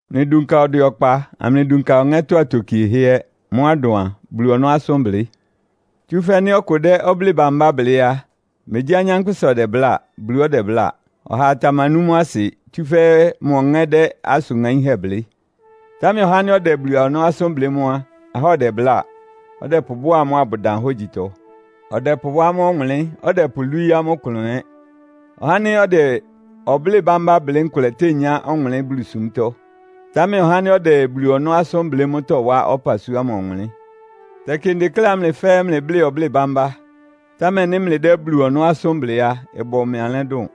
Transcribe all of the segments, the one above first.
Mlɩdunka ɔdwɛ ɔkpa, amlɩdunka ɔŋɛ́tɔ́ atokiehɛ́ ɛ́. Mʋ́á ɩdʋn a, Bulu ɔnɔ́ asʋ́nblɩ́. Tsúfɛ́ nɩ́ ɔkʋ dɛ́ ɔblɩ́ɩ bambá blɩ́ á, megyí anyánkpʋ́sa ɔdɛbláa, Bulu ɔdɛbláa. Ɔhaa tamanú mʋ́ asɩ, tsúfɛ́ mʋ ɔŋɛ́ dɛ́ asʋn ŋaínhɛ́ blɩ́. Támɛ ɔhá ánɩ́ ɔdɛ Bulu ɔnɔ́ asʋ́n blɩ́ mʋ́ á, ahá ɔdɛbláa, ɔdɛpʋbʋ́a amʋ́ abʋdan hógyitɔ. Ɔdɛpʋwá amʋ́ ɔwʋnlɩ́n, ɔdɛpʋlwíí amʋ́ ɩklʋn ɛ́. Ɔhá ánɩ́ ɔdɛ ɔblɩ́ɩ bambá blɩ́ nkʋlɛ tényá ɔwʋnlɩ́n Bulusúmtɔ́. Támɛ ɔhá ánɩ́ ɔdɛ Bulu ɔnɔ́ asʋ́n blɩ́ mʋ́ tɔwá ɔpasua ámʋ ɔwʋnlɩ́n. Tɛkɩ ndekléá mlɩ fɛ́ɛ́ mlɛ́blɩ́ ɔblɩ́ɩ bambá, támɛ nɩ́ mlɩdɛ́ Bulu ɔnɔ́ asʋ́n blɩ́ á, ɩbʋ mɩ alɛ́ dʋn.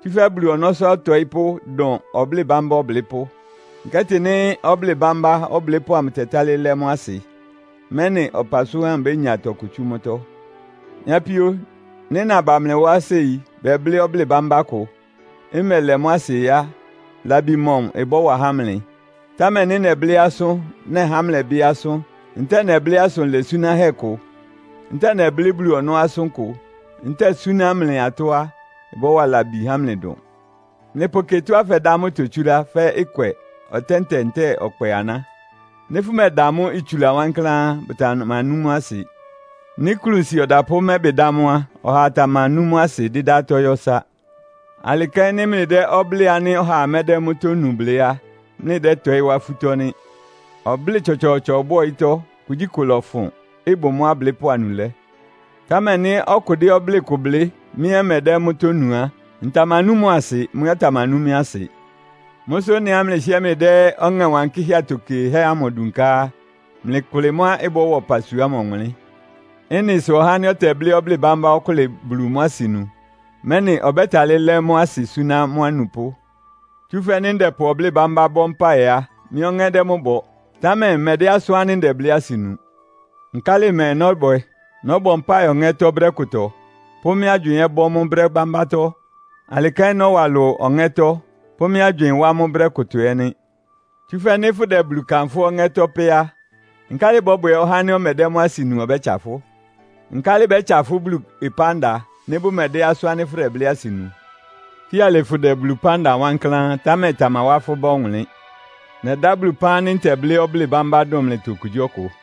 Tsúfɛ́ Bulu ɔnɔ́sʋ́ ɔtɔɩ́pʋ́ dʋn ɔblɩ́ɩ bambá ɔblɩ́pʋ́. Nkɛ́tɩ nɩ́ ɔblɩ́ɩ bambá ɔblɩ́pʋ́ ámʋ tɛtálɩ́ lɛ́ mʋ́ asɩ, mɛ́nɩ ɔpasua ámʋ bénya tɔkʋ tsú mʋ́tɔ́. Mɩ́ apíó, nɩ́ naba mlɩ wá séi bɛblɩ́ ɔblɩ́ɩ bambá kʋ, mmɛlɛ mʋ́ asɩ á, labi mɔmʋ ɩbɔ́wa há mlɩ? Támɛ nɩ́ nɛblɩ́ asʋ́n, nɛhá mlɛ́bɩ asʋ́n, ntɛ́ɛ nɛblɩ́ asʋn lɛsúnáhɛ́ kʋ, ntɛ́ɛ nɛblɩ́ Bulu ɔnɔ́ asʋ́n kʋ, ntɛ́ɛ súná mlɩ atɔ́ á, ɩbɔ́wa labi há mlɩ dʋn. Mlɩpʋkɩ ɩtɔ́á fɛdá mʋ́ itotsúlá, fɛ́ ɩkwɛ, ɔtɛ́ntɛ ntɛ́ɛ ɔkpɛ aná. Nɩ́ fʋmɛda mʋ́ itsula wankláán á, bʋtamanú mʋ́ asɩ. Nɩ́ klunsi ɔdapʋ́ mɛ́bɩ dá mʋ́ á, ɔhaa tamanú mʋ́ asɩ, dɩ́dá atɔ́ yɔ́ ɩsá. Alɩ kɛ́n nɩ́ mlɩdɛ́ ɔblɩ́ɩ ánɩ́ ɔhaa mɛ́dɛ́ mʋ́tɔ́ nu blɩ́ á, mlɩdɛ́tɔɩ́ wá afútɔ́ nɩ́. Ɔblɩ́ɩ tsɔtsɔɔtsɔ bʋ ɔyɩ́tɔ́. Kugyíkʋ ɩlɔfʋn, ɩbʋ mʋ́ ablɩ́pʋ́ anulɛ́. Támɛ nɩ́ ɔkʋ dɛ́ ɔblɩ́ɩ kʋ blɩ́, mɩ́ ɛ́ mmɛdɛ́ mʋ́tɔ́ nu á, ntamanú mʋ asɩ, mʋ ɛ́ ɔtamanú mɩ́ asɩ. Mʋ́ sʋ ɩ́nɩá mlɩhɩ́ɛ́ mlɩdɛ́ Ɔŋɛ Wankɩ́hɛ́ atokiehɛ́ ámʋ dunká á, mlɩkʋlɩ mʋ́á ɩbɔ́wa ɔpasua ámʋ ɔwʋnlɩ́n. Ɩ́nɩ sʋ ɔhá ánɩ́ ɔtɛblɩ́ ɔblɩ́ɩ bámbá ɔkʋ́lɩ Bulu mʋ́ asɩnu, mɛ́nɩ ɔbɛ́talɩ́ lɛ mʋ́ asɩ súná mʋ́ anupʋ́. Tsúfɛ́ nɩ́ ndɛpʋ ɔblɩ́ɩ bámbá bɔ́ mpáɩ á, mɩ́ ɔŋɛ́ dɛ́ mʋ́ bɔ, támɛ mmɛdɛ́ asʋ́n ánɩ́ ndɛblɩ́ asɩ nu. Nkálɩ mɛɛ nɔ́bwɛ? Nɔ́bɔ mpáɩ ɔŋɛ́tɔ́ brɛ́ kʋtɔ, pʋ́ mɩ́ agywɩɩn ɛ́ bɔ́ mʋ́ brɛ́ bámbátɔ́. Alɩ kɛ́n nɔ́wa ɩlʋ ɔŋɛ́tɔ́, pʋ́ mɩ́ agywɩɩn wá mʋ́ brɛ́ kʋtɔ ɛ́ nɩ́. Tsúfɛ́ nɩ́ fʋ́dɛ Bulu kanfʋ́ ɔŋɛ́tɔ́ pɛ́ á, nkálɩ ɩbɔ́bwɛ ɔhá ánɩ́ ɔmɛdɛ́ mʋ́ asɩ nu ɔbɛ́tsa fʋ́? Nkálɩ bɛ́tsa fʋ́ Bulu ɩpán da nɩ́ bʋmɛdɛ́ asʋ́n ánɩ́ fʋdɛblɩ́ asɩ nu? Fíalɩ fʋdɛ Bulu ɩpán da wankláán, támɛ ɩtamawá fʋ́ bá ɔwʋnlɩ́n. Nɛdá Bulu ɩpán ánɩ́ ntɛblɩ́ ɔblɩ́ɩ bambá dʋn mlɩtɔ okugyíɔkʋ.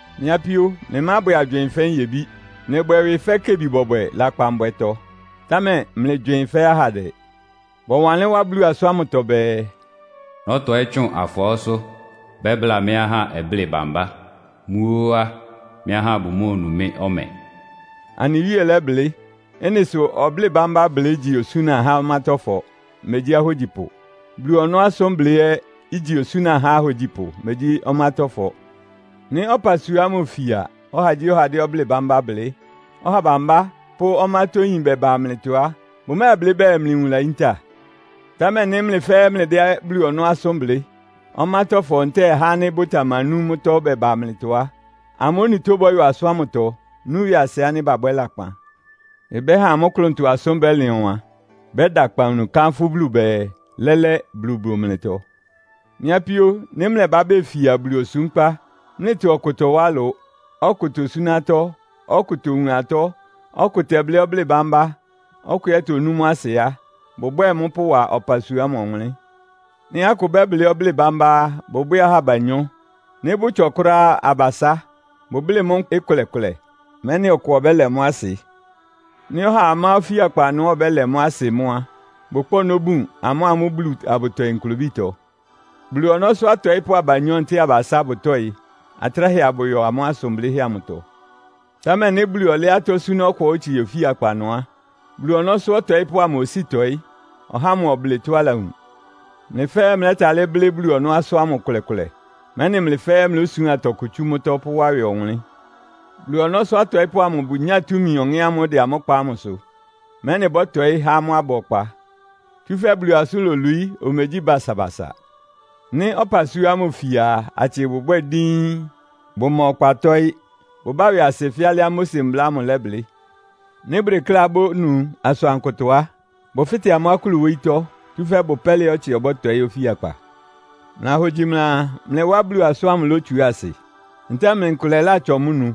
Mɩ́ apíó, mlɩmábwɛ agywɩɩn fɛ́ nyebí. Mlɩbwɛ ɩwɩ fɛ́ kebi-bɔbwɛ lakpanbwɛtɔ, támɛ mlɩgywɩɩn fɛ́ ahandɛ. Bɔwanlɩ́n wá Bulu asʋ́n ámʋtɔ bɛɛ, “Nɔ́tɔɩ́ tsʋn afɔɔ́sʋ́, bɛ́bláa mɩ́ ahá ɔblɩ́ɩ bambá. Mʋ́ ó á, mɩ́ ahá bʋmóonu mɩ́ ɔmɛ.” Anɩ Wíe lɛ́blɩ́. Ɩ́nɩ sʋ ɔblɩ́ɩ bambá blɩ́ igyi osúna há ɔmátɔ́fɔ, megyí ahógyipʋ. Bulu ɔnɔ́ asʋ́n blɩ́ ɛ́ igyi osúna há ahógyipʋ, megyi ɔmátɔ́fɔ. Nɩ́ ɔpasua ámʋ ifia, ɔhagyíɔha dɛ́ ɔblɩ́ɩ bambá blɩ́, ɔha bambá pʋ́ ɔmátɔ́yín bɛbá mlɩtɔ á, bʋmɛ́ɛblɩ́ bɛɛ, mlɩ nwun layíntá? Támɛ nɩ́ mlɩ fɛ́ɛ́ mlɩdɛ́ Bulu ɔnɔ́ asʋ́n blɩ́, ɔmátɔ́fɔ ntɛ́ɛ ahá ánɩ́ bʋtamanú mʋ́tɔ́ bɛbá mlɩtɔ á, amʋ́ onutó bɔ́yɔ asʋ́n ámʋtɔ, nú ɩwɩasɩ ánɩ́ babwɛ́ lakpan. Ɩbɛ́ha amʋ́ klʋntɔ asʋ́n bɛ́lɩn ɔwan, bɛ́da akpawunu, kánfʋ́ Bulu bɛɛ, “Lɛ́lɛ́, Bulu bʋ mlɩtɔ.” Mɩ́ apíó, nɩ́ mlɛbá befia Bulu osúmkpá, mlɩtɔ ɔkʋ tɔwá ɩlʋ, ɔkʋ tosúná atɔ́, ɔkʋ towun atɔ́, ɔkʋ tɛblɩ́ ɔblɩ́ɩ bámbá, ɔkʋ ɛ́ tonú mʋ́ asɩ á, bʋbwɛ́ɛ mʋ́ pʋwa ɔpasua ámʋ ɔwʋnlɩ́n. Nɩ́ akʋ bɛ́blɩ́ ɔblɩ́ɩ bámbá á, bʋbwɛ́ɛ ahá abanyɔ́. Nɩ́ bʋtsɔ kʋ́ráá á, abasá. Bʋblɩ́ mʋ́ ɩkʋlɛ-kʋlɛ, mɛ́nɩ ɔkʋ ɔbɛ́lɛ mʋ́ asɩ. Nɩ́ ɔhaa má ofíakpa ɩnʋá ɔbɛ́lɛ mʋ́ asɩ mʋ́ á, bʋkpá ɔnɔ́ bun, amʋ́a amʋ́ Bulu abʋtɔɩ nklobítɔ. Bulu ɔnɔ́sʋ́ atɔɩ́pʋ́ abanyɔ́ ntɛ́ɛ abasá bʋtɔ́ɩ, atráhɛ abʋyɔ amʋ́ asʋn blɩ́hɛ́ amʋtɔ. Támɛ nɩ́ Bulu ɔlɛ́ atɔ́ súná ɔkʋá otsie ofíakpa ɩnʋ á, Bulu ɔnɔ́sʋ́ ɔtɔɩ́pʋ́ ámʋ osíi tɔɩ́, ɔhá ámʋ ɔblɩ tɔ́á alawun. Mlɩ fɛ́ɛ́ mlɛ́talɩ́ blɩ́ Bulu ɔnɔ́ asʋ́n ámʋ ɩkʋlɛ-kʋlɛ, mɛ́nɩ mlɩ fɛ́ɛ́ mlósuán tɔkʋ tsú mʋ́tɔ́ pʋ́wá ɩwɩ ɔwʋnlɩ́n. Bulu ɔnɔ́sʋ́ atɔɩ́pʋ́ amʋ bʋnyáa túmi ɔŋɛ́ ámʋ́ʋ́ ɩdɛ amʋ́ kpa amʋ́sʋ́, mɛ́nɩ bɔ́tɔɩ́ há amʋ́ aba ɔkpa. Tsúfɛ́ Bulu asʋ́n lolwií, omegyí basabasa. Nɩ́ ɔpasua ámʋ ifia a, atsɩ bʋbwɛ́ɛ díín. Bʋma ɔkpa tɔ́ɩ́. Bʋbá ɩwɩasɩ fɛ́ alɩá Mose Mbla lɛ́blɩ́. Nɩ́ bʋdekléá bónu asʋankʋtɔ á, bʋfɩ́tɛ amʋ́ akúlu wóyítɔ́, tsúfɛ́ ɩbʋ pɛ́lɩá ɔtsɩ ɔbɔ́tɔɩ́ ofíakpa. Mlɩlahogyi mlɩaa, mlɩ wá Bulu asʋ́n ámʋ ilotsuá asɩ? Ntɛ́ɛ mlɩ nkʋlɛ látsɔ mʋ́ nu?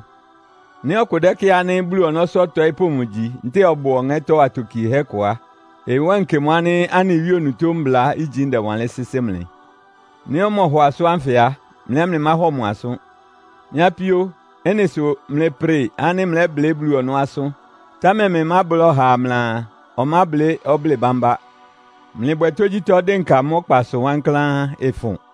Nɩ́ ɔkʋ dɛ́kɩ́ɩ ánɩ́ Bulu ɔnɔ́sʋ́ ɔtɔɩ́pʋ́ mʋgyi, ntɛ́ɛ ɔbʋ Ɔŋɛ́tɔ́ atokiehɛ́ kʋ á, ɩwánkɩ mʋ ánɩ́ anɩ Wíe onutó mbla ígyi ndɛwanlɩ́n sɩ́sɩ́ mlɩ. Nɩ́ ɔmɔhɔ asʋ́n ánfɩ á, mlɩ ɛ́ mlɩmáhɔ mʋ asʋ́n. Mɩ́ apíó, ɩ́nɩ sʋ mlɩprɩ ánɩ́ mlɛ́blɩ́ Bulu ɔnɔ́ asʋ́n, támɛ mlɩmábláa ɔhaa mlɩaa, ɔmáblɩ́ ɔblɩ́ɩ bambá. Mlɩbwɛ tógyítɔ́ dɩnka mʋ́ ɔkpasʋ wankláán, ɩfʋn.